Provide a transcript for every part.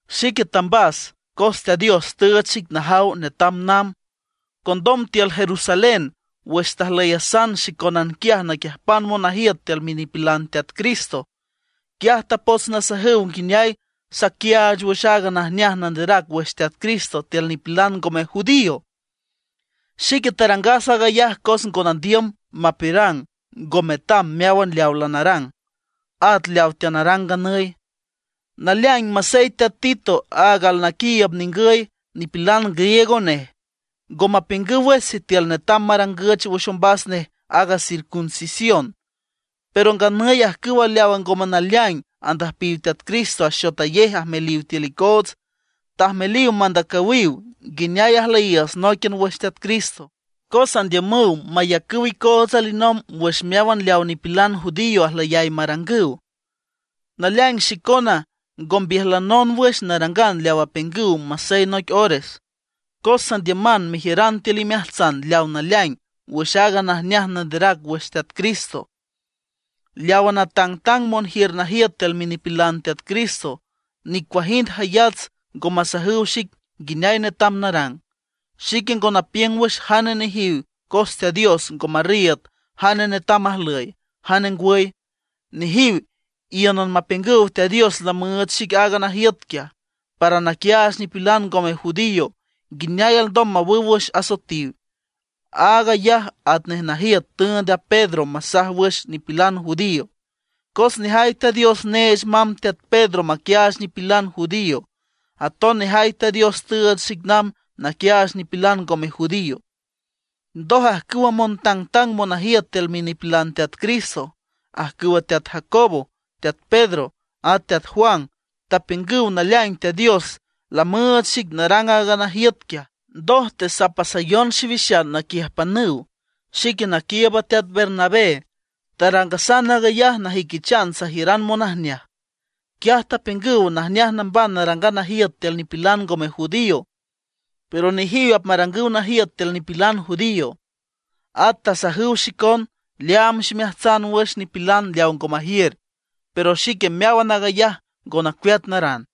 Xique tambas, cos Teat Dios tüüch xic najaw netam namb. Condom tiül Jerusalén, wüx tajlüyasan xicónan quiaj naquiüjpan monajiüt tiül minipilan Teat Cristo, quiaj tapots nasajüw nguineay saquiaach wüx aaga najneaj nanderac wüx Teat Cristo tiül nipilan ngome judío. Xique tarangas aag ayaj cos ngo nandiüm mapiürang ngo metam meáwan leaw lanarang, at leaw teanarang nganüy. Naleaing, masey teat Tito aag alnaquiiüb ningüy, nipilan griego nej, ngo mapiüngüw wüx sitiül netam marangüch wüx ombas nej aaga circuncisión. Pero nganüy ajcüwa leaw ngome naleaing andüjpiw Teat Cristo axotayej ajmeliw tiül icoots. Tajmeliw mandacüwiw nguineay ajlüyiiüts nóiquian wüx Teat Cristo, cos andiümüw mayacüw icoots alinomb wüx meáwan leaw nipilan judío ajlüyay marangüw. Naleaing xicona ngo mbiüjlanon wüx narangan leaw apiüngüw masey noic ores, cos sandiüman mejiüran tiül imeajtsan leawa naleaing wüx aaga najneaj nanderac wüx Teat Cristo. Leawa natangtang monjiür najiüt tiül minipilan Teat Cristo, nicuajind jayats ngo masajüw xic nguineay netam narang. Xique ngo napiüng wüx jane nejiw cos Teat Dios ngo marriiüd jane netam ajlüy, jane ngwüy. Nejiw íünan mapiüngüw Teat Dios lamüüch xic aaga najiüt quiaj, para naquiaach nipilan ngome judío nguineay alndom mawüw wüx asoetiw. Aag ayaj atnej najiüt tüünd teat Pedro masaj wüx nipilan judío. Cos nejay Teat Dios neech mamb teat Pedro maquiaach nipilan judío, aton nejay Teat Dios tüüch xic namb naquiaach nipilan ngome judío. Ndoj ajcüwa montangtang monajiüt tiül minipilan Teat Cristo, ajcüwa teat Jacobo, teat Pedro, ata teat Juan, tapiüngüw naleaing Teat Dios lamüüch xic narang aaga najiüt quiaj; ndoj tesapasayon xiwixan naquiüjpanüw, xique naquiiüb a teat Bernabé. Tarangasan aag ayaj najüiquichan sajiüran monajneaj. Quiaj tapiüngüw najneaj namban narangan najiüt tiül nipilan ngome judío; pero nejiw apmarangüw najiüt tiül nipilan judío. At tasajüw xicon leaam ximeajtsan wüx nipilan leaw ngo majiür; pero xique meáwan aag ayaj ngo nacueat narang.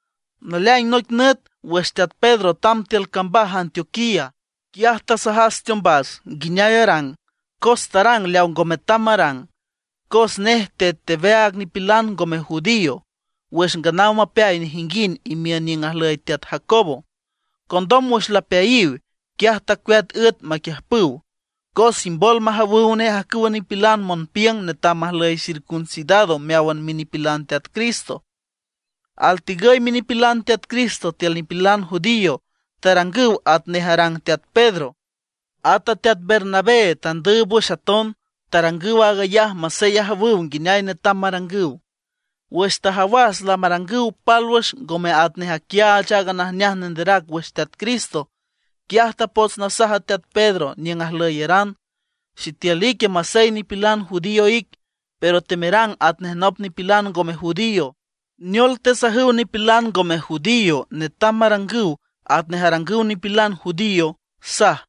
Naleaing noic nüt wüx teat Pedro tamb tiül cambaj Antioquía, quiaj tasajas teombas nguineay arang, cos tarang leaw ngo metam marang. Cos nej tet aweaag nipilan ngome judío wüx nganaw mapeay nejinguind imiün niüng ajlüy teat Jacobo. Condom wüx lapeayiw, quiaj tacueat üet maquiüjpüw, cos imbol majawüw nej ajcüwa nipilan monpiüng netam majlüy circuncidado meáwan minipilan Teat Cristo. Altegüy minipilan Teat Cristo tiül nipilan judío tarangüw atnej arang teat Pedro. Ata teat Bernabé tandüüb wüx aton, tarangüw aaga ayaj masey ajawüw nguineay netam marangüw. Wüx tajawas lamarangüw pálwüx ngome atnej aquiaach aaga najneaj nanderac wüx Teat Cristo, quiaj tapots nasaj a teat Pedro niüng ajlüyeran: “Sitiül ique masey nipilan judío ic, pero temerang atnej nop nipilan ngome judío, ¿neol tesajüw nipilan ngome judío netam marangüw atnej arangüw nipilan judío?” saj.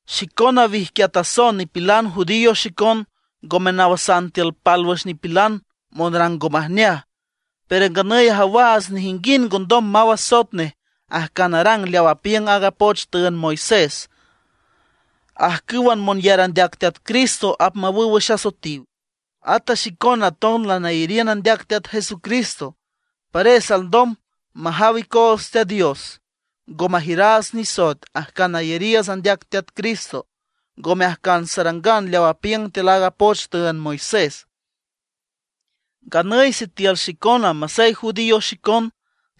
Xicona wijquiatason nipilan judío xicon, ngome nawasan tiül pálwüx nipilan monrang ngo majneaj. Pero nganüy ajawaats nejinguind ngondom maw asoet nej ajcan arang leaw apiüng aaga poch tüünd Moisés. Ajcǘwan monyar andeac Teat Jesucristo apmawüw wüx asoetiw. Ata xicona aton lanayariün andeac Teat Jesucristo, pares alndom majaw icoots Teat Dios ngo majiüraats nisoet ajcan ayariiüts andeac Teat Cristo, ngome ajcan sarangan leaw apiüng tiül aaga poch tüünd Moisés. Nganüy sitiül xicona masey judío xicon,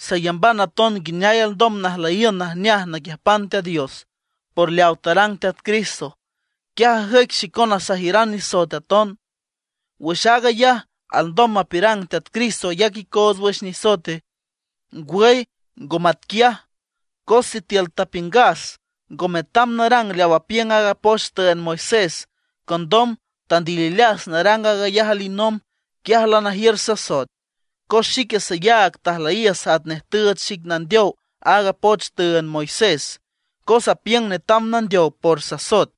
sayamban aton nguineay alndom najlüyiün najneaj naquiüjpan Teat Dios por leaw tarang Teat Cristo; quiaj ajüic xicona sajiüran nisoet aton. ¿Wüx aag ayaj alndom mapiürang Teat Cristo ayac icoots wüx nisoete? ¡Ngwüy ngo matquiaj! Cos sitiül tapiüngas ngo metam narang leaw apiüng aaga poch tüünd Moisés, condom tandilileas narang aag ayaj alinomb, quiaj lanajiür sasoet. Cos xique sayaag tajlüyiüs atnej tüüch xic nandeow aaga poch tüünd Moisés, cos apiüng netam nandeow por sasoet.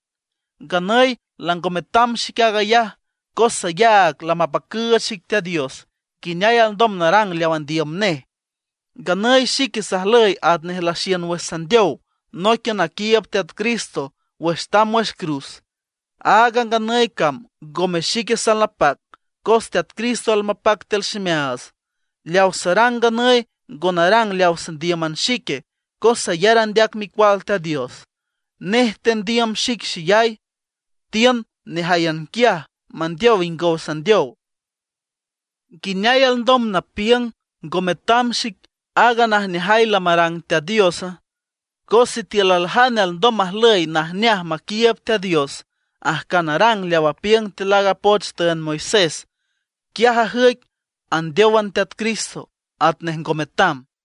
Nganüy lango metam xic aag ayaj, cos sayaag lamapacüüch xic Teat Dios nguineay alndom narang leaw andiüm nej. Nganüy xique sajlüy atnej laxiün wüx sandeow nóiquian naquiiüb Teat Cristo wüx tamb wüx cruz. Aaga nganüy cam ngome xique salnapac, cos Teat Cristo almapac tiül ximeaats. Leaw sarang nganüy ngo narang leaw sandíüman xique, cos sayar andeac Micual Teat Dios. Nej tandiüm xic xeyay, tiün nejáyan quiaj mandeow ingow sandeow. ¿Nguineay alndom napiüng ngo metam xic aaga najneajay lamarang Teat Diosa? Cos sitiül aljane alndom majlüy najneaj maquiiüb Teat Dios ajcan arang leaw apiüng tiül aaga poch tüünd Moisés, quiaj ajüic andeówan Teat Cristo, atnej ngo metam.